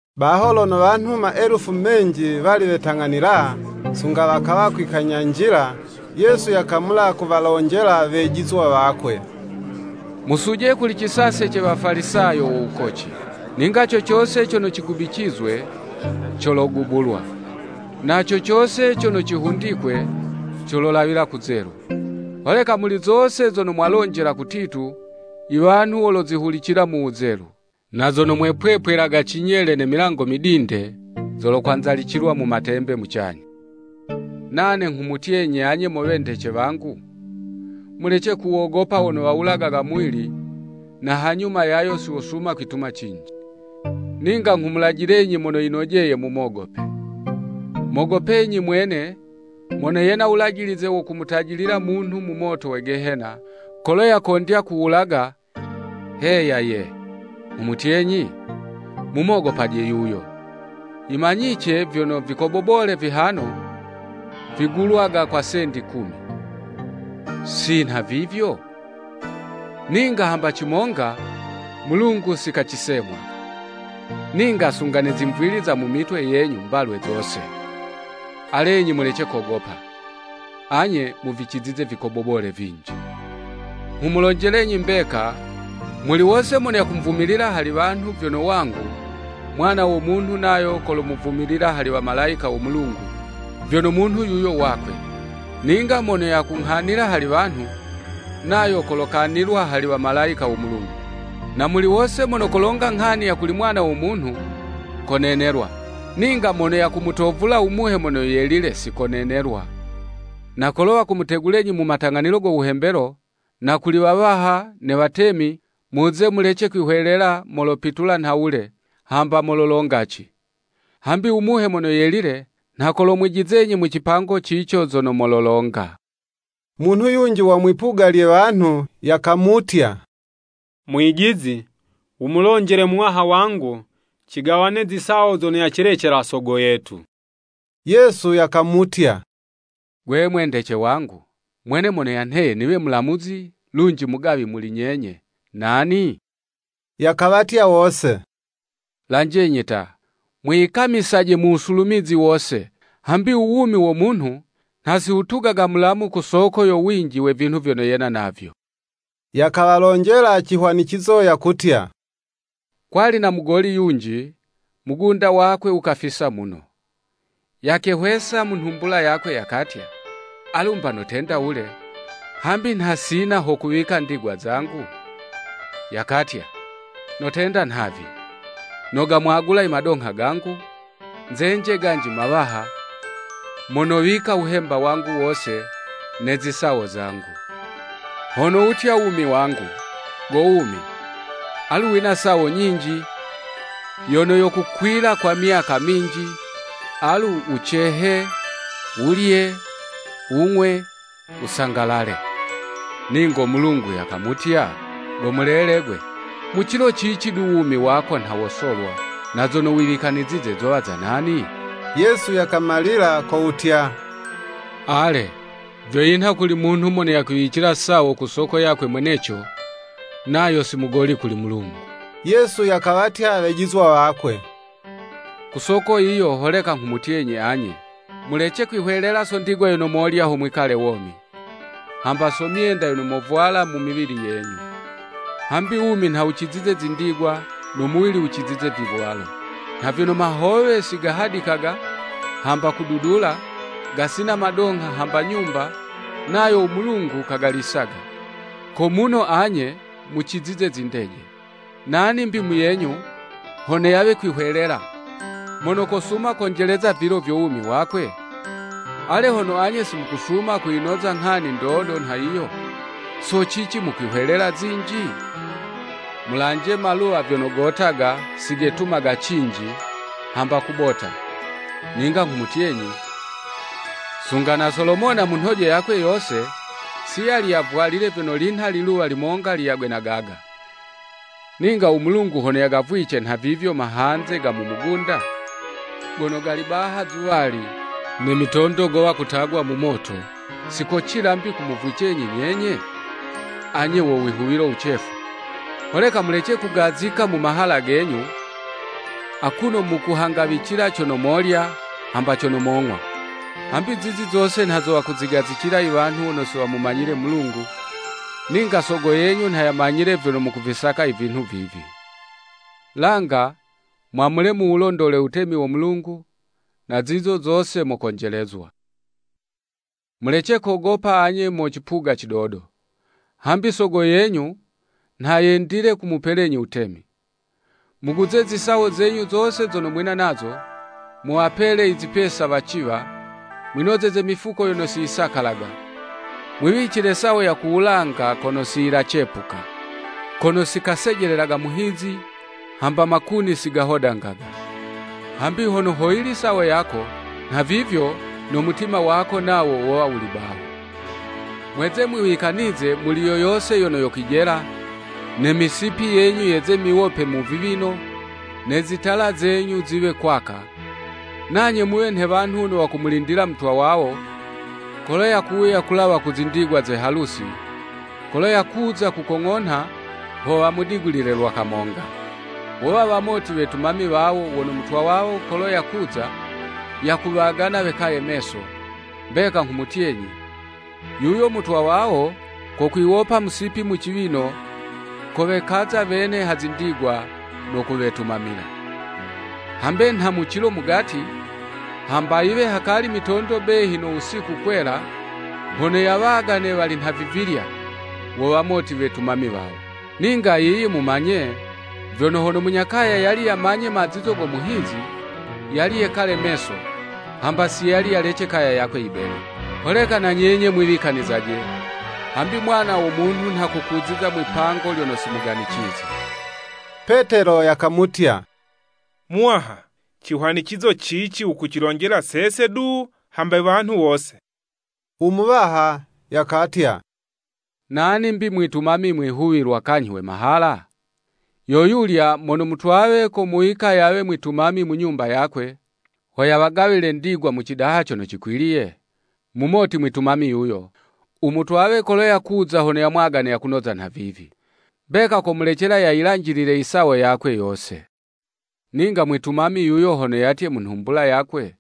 Baho lono wanhu maelufu menji wali wetang'anila, sunga wakawa kwikanyanjila, Yesu yakamula kuwalonjela wejizwa wakwe, “Musuje kuli cisase ce wafalisayo wo wukoci. Ninga cocose cono cigubicizwe, cologubulwa, na cocose cono cihundikwe, c ololawila kuzelu. Holeka muli zose zono mwalonjela kutitu, i wanhu wolozihulicila mu wuzelu, na zono mwepwepwelaga cinyele ne milango midinde, zolokwanzalicilwa mu matembe mucanyha.” Nane nghumutyenyi anye mo wendece wangu, “Mulece kuwogopa wono wawulagaga muwili, na hanyuma yayo si wosuma kwituma cinji. Ninga nghumulajilenyi mono yinojeye mumogope: Mogopenyi mwene, mono yena wulajilize wo kumutajilila munhu mu moto we gehena, kolo yakondya kuwulaga, heya ye, nghumutyenyi, Mumogopaje yuyo. Yimanyice vyono vikobobole vihano, vigulwaga kwa sendi kumi, si nha vivyo? Ninga hamba cimonga Mulungu si kacisemwaga. Ninga sunga ne zimwvili za mu mitwe yenyu mbalwe zose. Alenyi mulece kogopa, anye muvicizize vikobobole vinji.” Nghumulonjelenyi mbeka, muli wose mono yakumvumilila hali wanhu, vyono wangu, Mwana wo Munhu nayo kolomuvumilila hali Wamalayika wo Mulungu, vyono munhu yuyo wakwe. Ninga mono yakunghanila hali wanhu, nayo kolokanilwa hali Wamalayika wo Mulungu. Na muli wose mono kolonga nghani yono kuli Mwana wo Munhu, konenelwa; ninga mono yakumutovula u Muhe Mono Yelile si konenelwa. Na kolo wakumutegulenyi mu matang'anilo go wuhembelo, na kuli wawaha, ne watemi, muze mulece kwihwelela molopitula nhawule, hamba mololonga ci. Hambi u Muhe Mono Yelile nha kolomwijizenyi mu cipango cico zono mololonga. Munhu yunji wa mwipuga lye wanhu, yakamutya, “Mwijizi, wumulonjele muwaha wangu cigawane zisawo zono yacilecela sogo yetu.” Yesu yakamutya, “Gwe mwendece wangu, mwene mono yanheye niwe mulamuzi lunji mugawi muli nyenye, nani?” Yakawatya wose, “Lanjenyi ta, mwiyikamisaje mu wusulumizi wose, hambi u wumi wo munhu nha si wutugaga mulamu ku soko yo winji we vinhu vyono yena navyo.” Yakawalonjela cihwanicizo yakutya, “Kwali na mugoli yunji, mugunda wakwe wukafisa muno. Yakehwesa mu nhumbula yakwe yakatya, ‘Alu 'mba notenda wule, hambi nha sina ho kuwika ndigwa zangu?’ Yakatya, Notenda nhavi, nogamwagula i madongha gangu, nzenje ganji mawaha, mo nowika wuhemba wangu wose, ne zisawo zangu. Ho nowutya wumi wangu, ‘Go wumi, alu wina sawo nyinji yono yokukwila kwa myaka minji, alu wucehe, wulye, wung'we, wusangalale.’ Ningo Mulungu yakamutya, ‘Go mulele gwe, mu cilo cici du wumi wako nha wosolwa na zono wiwikanizize zowa za nani?'" Yesu yakamalila ko wutya, “Ale, vyo yinha kuli munhu mono yakwiwicila sawo ku soko yakwe mweneco, nayo si mugoli kuli Mulungu.” Yesu yakawatya wejizwa wakwe, “Ku soko yiyo holeka nghumutyenyi anye. Mulece kwihwelela so ndigwa yono molya ho mwikale womi, hamba so myenda yono mosaka so miwili yenyu. Hambi wumi nha wucizize zindigwa, no muwili wucizize vivwalo. Nha vyono mahowe, si gahadikaga, hamba kududula, gasina madongha hamba nyumba, nayo u Mulungu kagalisaga: ko muno anye muzicizize zindeje! Nani 'mbi muyenyu, hono yawe kwihwelela, mono kosuma konjeleza vilo vyo wumi wakwe? Ale hono anye si mukusuma kuyinoza nghani ndodo nha yiyo, so cici mukwihwelela zinji? Mulanje maluwa vyono gotaga, si getumaga cinji, hamba kubota; ninga nghumutyenyi, sunga na Solomona mu nhojo yakwe yose, si yali yavwalile vyono linha liluwa limonga liyagwe na gaga. Ninga u Mulungu hono yagavwice nhavivyo mahanze ga mu mugunda, gono gali baha izuwali, ne mitondo gowa kutagwa mu moto; si kocila 'mbi kumuvwicenyi nyenye? Anye wo wihuwilo wucefu! Holeka mulece kugazika mu mahala genyu, akuno mukuhangawicila cono molya, hamba cono mong'wa. Hambi zizi zose nha zo wakuzigazicila i wanhu wono si wamumanyile Mulungu, ninga Sogo yenyu nha yamanyile vyono mukuvisaka i vinhu vivi. Langa, mwamule muwulondole wutemi wo Mulungu, na zizo zose mokonjelezwa. “Mulece kogopa anye mo cipuga cidodo, hambi Sogo yenyu nha yendile kumupelenyi wutemi. Muguze zisawo zenyu zose zono mwina nazo, muwapele i zipesa waciwa, mwinozeze mifuko yono si yisakalaga, mwiwicile sawo ya ku wulanga kono si yilacepuka. Kono si kasejelelaga muhizi, hamba makuni si gahodangaga. Hambi hono hoyili sawo yako, nhavivyo no mutima wako nawo wowa wuli baho. “Mweze mwiwikanize muli yoyose yono yokwijela, ne misipi yenyu yeze miwope mu viwino, ne zitala zenyu ziwe kwaka; nanye muwe nhe wanhu wono wakumulindila mutwa wawo, kolo yakuwuya kulawa mu zindigwa ze halusi; kolo yakuza yakukong'onha, ho wamudigulile lwa kamonga. Wowa wamoti wetumami wawo wono mutwa wawo kolo yakuza, yakuwagana wekaye meso, mbeka nghumutyenyi, yuyo mutwa wawo, kokwiwopa musipi mu ciwino, kowekaza wene ha zindigwa, no kuwetumamila. Hambe nha mu cilo mugati, hamba yiwe hakali mitondo muno behi no wusiku kwela, hono yawagane wali nhavivilya, wo wamoti wetumami wawo. Ninga yiyi mumanye vyono, hono munya kaya yali yamanye mazizo go muhizi, yali yekale meso, hamba si yali yayilece kaya yakwe yibenwe. Holeka na nyenye mwiwikanizaje, hambi Mwana wo Munhu nha kokuziza mwipango lyono si muganicize.” Petelo yakamutya, “Muwaha, cihwanicizo cici wukucilonjela sese du, hamba wanhu wose?” U Muwaha yakatya, “Nani 'mbi u mwitumami mwihuwilwa kanyhi we mahala? Yo yulya mono mutwawe komuwika yawe mwitumami mu nyumba yakwe, ho yawagawile ndigwa mu cidaha cono cikwiliye?” Mumoti mwitumami yuyo, u mutwawe kolo yakuza hono yamwagane yakunoza nhavivi. Mbeka komulecela yayilanjilile i sawo yakwe yose. Ninga mwitumami yuyo hono yatye mu nhumbula yakwe,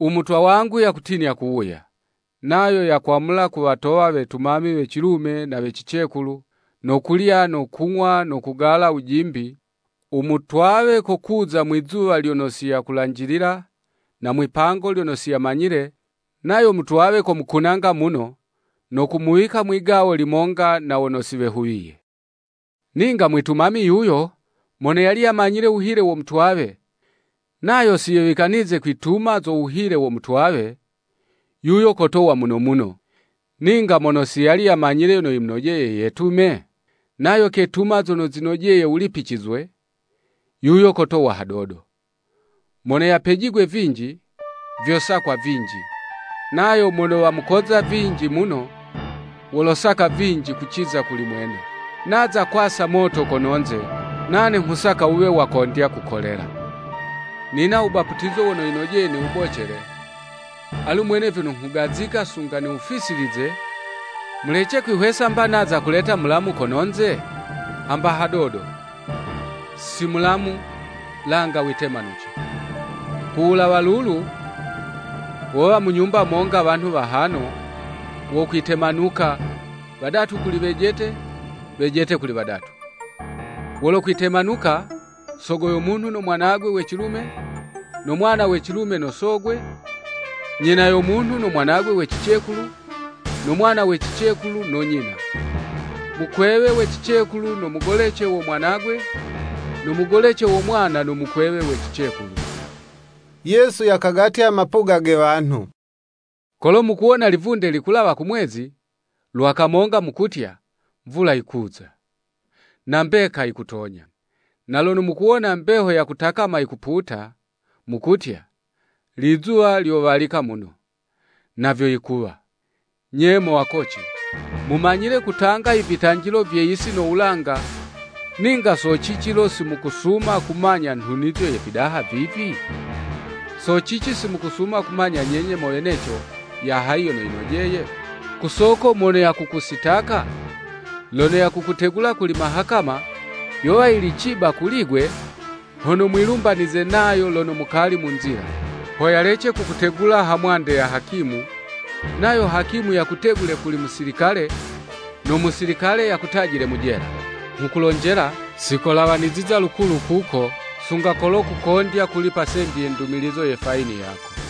“U mutwa wangu yakutinya kuwuya.” Nayo yakwamula kuwatowa wetumami we cilume na we cicekulu, no kulya no kung'wa no kugala wujimbi, u mutwawe kokuza mwi'zuwa lyono si yakulanjilila, na mwi'pango lyono si yamanyile, nayo mutwawe kumukunanga muno, no kumuwika mwi'gawo limonga na wono si wehuwiye. Ninga mwitumami yuyo mono yali yamanyile wuhile wo mutwawe, nayo si yewikanize kwituma zo wuhile wo mutwawe, yuyo kotowa muno muno, ninga mono si yali yamanyile yono yimonojeye yetume, nayo ketuma zono zinojeye wulipicizwe, yuyo kotowa hadodo. Mono yapejigwe vinji, vyosakwa vinji, nayo mono wamukoza vinji muno, wolosaka vinji kuciza kuli mwene. “Naza kwasa moto kono'nze, nane nghusaka wuwe wakondya kukolela. Nina wubaputizo wono yinojeye niwubocele; alu mwene vyono nghugazika sunga niwufisilize!” Mulece kwihwesa 'mba naza kuleta mulamu kononze? Hamba hadodo, si mulamu, langa witemanuce. Ku wulawa lulu, wowa mu nyumba monga wanhu wahano, wokwitemanuka, wadatu kuli wejete, wejete kuli wadatu. Wolokwitemanuka, sogo yo munhu no mwanagwe we cilume, no mwana we cilume no sogwe; nyina yo munhu no mwanagwe we cicekulu, no mwana we cicekulu no nyina; mukwewe we cicekulu no mugolece wo mwanagwe, no mugolece wo mwana no mukwewe we cicekulu. Yesu yakagatya mapuga ge wanhu, “Kolo mukuwona livunde likulawa kumwezi, lwa kamonga mukutya, mvula yikuza.” Na mbeka yikutonya. Na lono mukuwona mbeho ya kutakama yikuputa, mukutya, “Lizuwa lyo walika muno.” Na vyo yikuwa. Nye mo wakoci, mumanyile kutanga ivitanjilo vye yisi no wulanga, ninga so cici lo si mukusuma kumanya nhunizo ye vidaha vivi? “So cici si mukusuma kumanya nyenye mo weneco, ya hayi yono yinojeye? Ku soko mono yakukusitaka, lono yakukutegula kuli mahakama, yowa yili ciba kuli'gwe, hono mwilumbanize nayo lono mukali mu nzila; ho yalece kukutegula ha mwande ya hakimu, nayo hakimu yakutegule kuli musilikale, no musilikale yakutajile mu jela. Nghukulonjela, sikolawaniziza lukulu kuko, sunga kolo kukondya kulipa sendi ye ndumilizo ye fayini yako.”